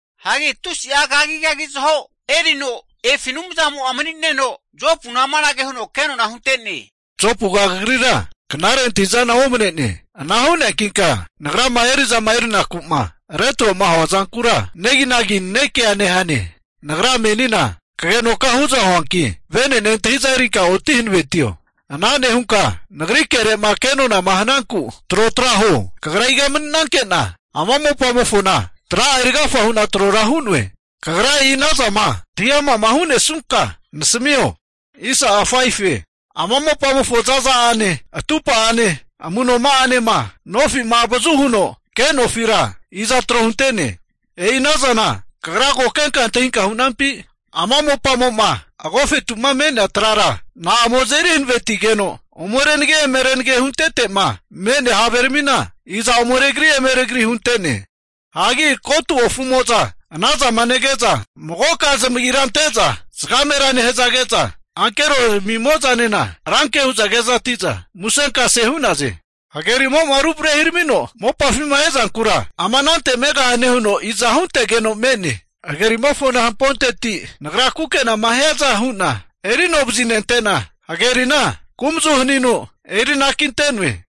Hagi tusi'a kagigagi zaho erino efi Anumzamo'a mani'neno, Jopuna amanage huno kenona hunte'ne, Jopuga kagrira knare antahi'zana omane'ne. Ana hu'neankinka Nagrama eri'zama erinaku'ma retro'ma hua zankura neginagi nanekea nehane. Nagra menina kagenoka hu'za huanki, vene'ne antahi'za erinka oti hankavetio. Ana nehunka Nagri kere'ma kenonama hananku trotra huo. Kagra iga mani'nankena ama mopamofona tra'a eri agafa hu'na trora hu'noe? Kagra e'i anazama antahi ama'ma hu'nesunka nasamio. Ama mopamofo za'za'ane atupa'ane amu'noma'anema nofi'ma (measurement) avazu huno ke nofira iza tro hunte'ne? E'i ana zana kagra ko kenka antahinka hu'nampi? Ama mopamo'ma agofetu'ma me'nea trara na'amo azeri hanavenetigeno, ome renage eme renage huntete'ma me'nea haveramina, ome regari eme regari hunte'ne? Hagi kotu ofumo'za anazama nege'za magoka zamagira ante'za zagamera nehazage'za, ankero ramimo'zanena ranke hu'za kezati'za musenkasea hu'naze. Hagerimo'ma ruvarehiramino mopafima ezankura ama anante megahane huno iza huntegeno me'ne? Hagerimofona hamponteti Nagra kukenama hiaza hu'na eri ano vazinente'na, hagerina kumazu haninu eri anakinte'noe.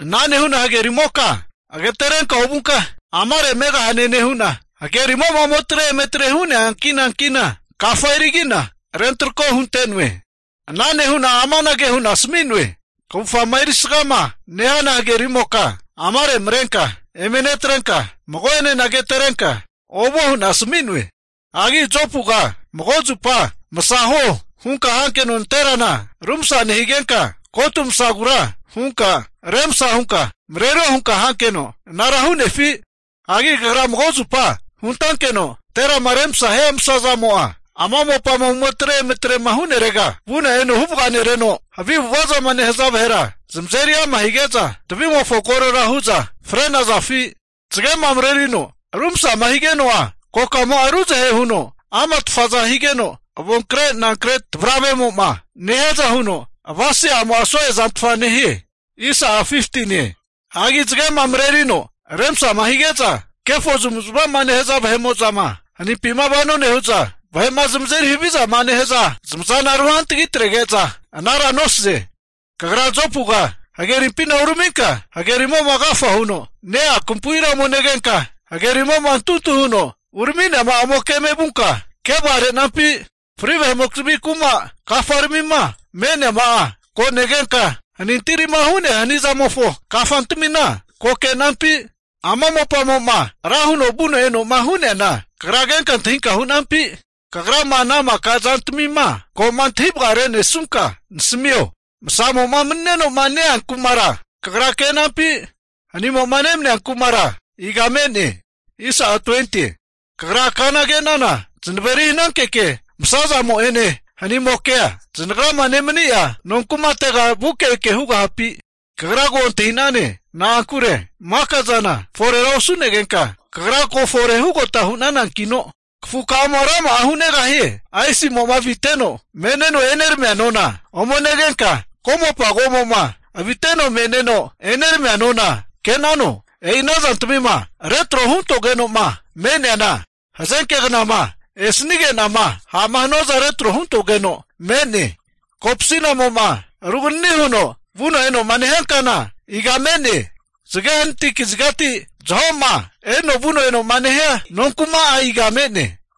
Ana nehu'na hagerimoka agaterenka ovunka, amare megahane nehu'na, hagerimo'ma ome atre eme atrema hu'nea ankina ankina, kafa erigi'na rentarako hunte'noe. Ana nehu'na amanage hu'na asami'noe. Kavufgama erisgama nehana hagerimoka amare marenka eme netrenka, mago'enena agatarenka ovuo hu'na asami'noe. Hagi Jopuga mago zupa masa huo hunka hankeno nanterana rumsa nehigenka, kotu masagura hunka remasa hunka marerio hunka hankeno anara hu'nefi? Hagi kagra mago zupa huntankeno nanterama remasama hia masazamo'a, ama mopama ometre eme trema hu'nerega vuno eno huvaga nereno, havi avu'ava zama nehaza vahera zamazeri ama hige'za tavimofo korora hu'za fre'nazafi? Zagema marerino rumasama higeno'a, kokamo'a ruzahe huno ama tfaza higeno, avonkrenankre tvaravemo'ma nehiaza huno avasese'amo'a so'e zantfa nehie. Hagi zagema marerino remsama hige'za, kefo zamavu'zmava zama nehaza vahe'mo'zama hanimpima vano nehu'za, vahe'ma zamazeri havizama nehaza vahe'mo'za zamazana ruhantgi trege'za anara nosaze. Kagra Jopuga hagerimpina uraminka hagerimo'ma agafa huno ne-ea kampuira ome negenka, hagerimo'ma amefenkame'ma urami'neama'a ome keme vunka kevaga re'nampi? Fri vahe'mokizmi kuma kafaramima me'neama'a ko negenka, hanintirima hu'nea hanizamofo kafantamina ko ke'nampi? Ama mopamo'ma ra huno vuno eno'ma hu'neana kagra kenka antahinka hu'nampi? Kagrama ana maka zantamima ko'ma antahi vagare'nesunka nasamio. Masamo'ma mani'neno'ma ne-ea kumara kagra kenampi? Hanimo'ma nemania kumara iga me'ne? Kagra kana ke'nana zanaveri hanankeke masamo'ene, hanimokea zanagrama nemani'a nonkumatega vuke eke hugahapi? Kagra ko antahi'nane, na'ankure maka zana forera osu'negenka kagra ko fore hugota hu'nanankino, kafukamo'a rama'a hu'negahie! Aisimo'ma aviteno me'neno eneramia nona ome negenka, ko'mopa ko'mo'ma aviteno me'neno eneramia nona ke'nano? E'i ana zantamima retro huntogeno'ma me'neana, hazenke knama esanige'nama ha'ma hanuaza retro huntogeno me'ne. Kopsinamo'ma ruganini huno vuno eno'ma nehia kana iga me'ne? Zage hanati kazigati zaho'ma erino vuno enoma nehia nonkuma'a iga me'ne?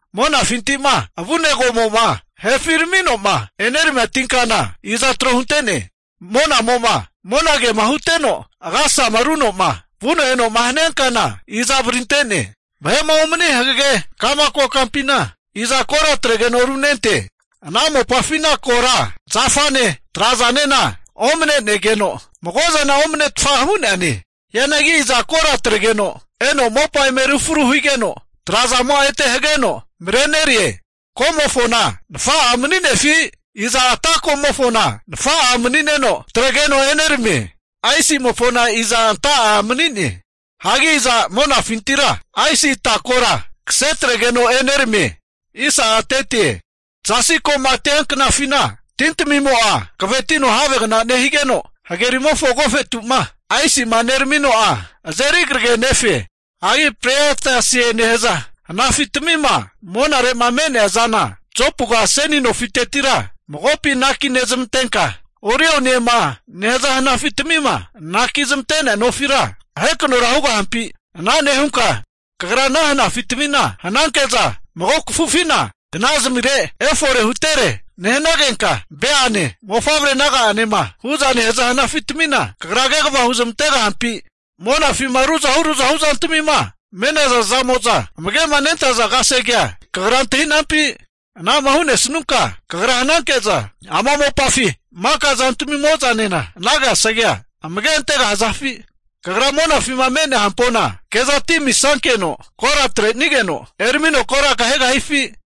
Monafinti'ma avune ko'mo'ma herafi ramino'ma eneramia tinkana iza tro hunte'ne? Monamo'ma monagema huteno agasasama runo'ma vuno eno'ma hania kana iza varinte'ne? Vahe'ma omani hagege ka'ma kokampina, iza kora atregeno runente? Ana mopafina kora, zafane trazanena omanenegeno mago zana omanetfa hu'neane. Hianagi iza kora atregeno eno mopa eme rufru higeno, trazamo'a ete hageno marenerie? Ko'mofona nafa'a mani'nefi? Iza ata komofona nafa'a mani'neno atregeno eneramie? Aisimofona iza anta'a mani'ne? Hagi iza monafintira aisi atakora kase atregeno eneramie? Zasi ko'matia knafina, tintamimo'a hankavetino havegna nehigeno, hagerimofo agofetu'ma aisima neramino'a azeri karagenefe. Hagi Pleiadesie nehaza hanafitamima, monare'ma me'nea zana Jopuga seni nofitetira magopi anaki nezmantenka, Orioniema nehaza hnafitamima anaki zmante'nea nofira ahekanora hugahampi? Ana nehunka kagra ana hanafitamina hananke'za, mago kafufina kna'zamire efore hutere nehanagenka, Beane mofavre naga'anema hu'za nehaza hanafitamina kagra kegava huzmantegahampi? Monafima ruzahu ruzahu zantamima me'naza zamo'za amage'ma nentaza kasegea kagra antahi'nampi? Ana'ma hu'nesnunka kagra hananke'za ama mopafi maka zantamimo'zanena ana kasegea amage antegahazafi? Kagra monafima me'nea hampona kezati misankeno, kora atrenigeno eramino kora kahegahifi?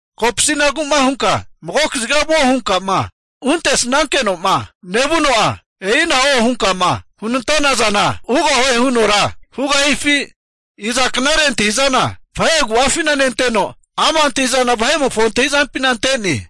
Kopasi'nagu'ma hunka mago kaziga vuo hunka'ma huntesnankeno'ma nevuno'a, e'ina huoma hunka hunantana zana hugahue hunora hugahifi? Iza knare antahi'zana, vahe agu'afina nenteno, ama' antahi'zana vahe'mofo antahi'zampina ante'ne?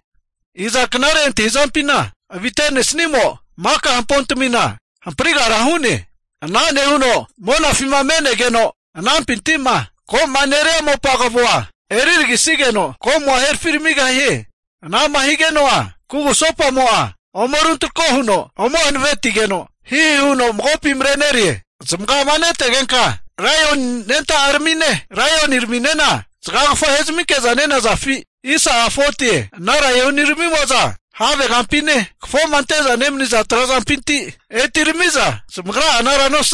Iza knare antahi'zampina avite'nesnimo maka hampontamina hamprigara hu'ne? Ana nehuno monafima me'negeno anampinti'ma ko'ma neria mopa kavoa eriragisigeno ko'mo'a herafiramigahie? Anama higeno'a kugusopamo'a ome runtrako huno eme hanavetigeno, hihi huno magopi marenerie. Zamagama netegenka Laioni anenta'a ramine, laioniraminena zagagafa ahezminke'za nenazafi? Ana laioniramimo'za havegampine, kafoma ante'za nemaniza trazampinti etirami'za zamagra'a anara nosazafi?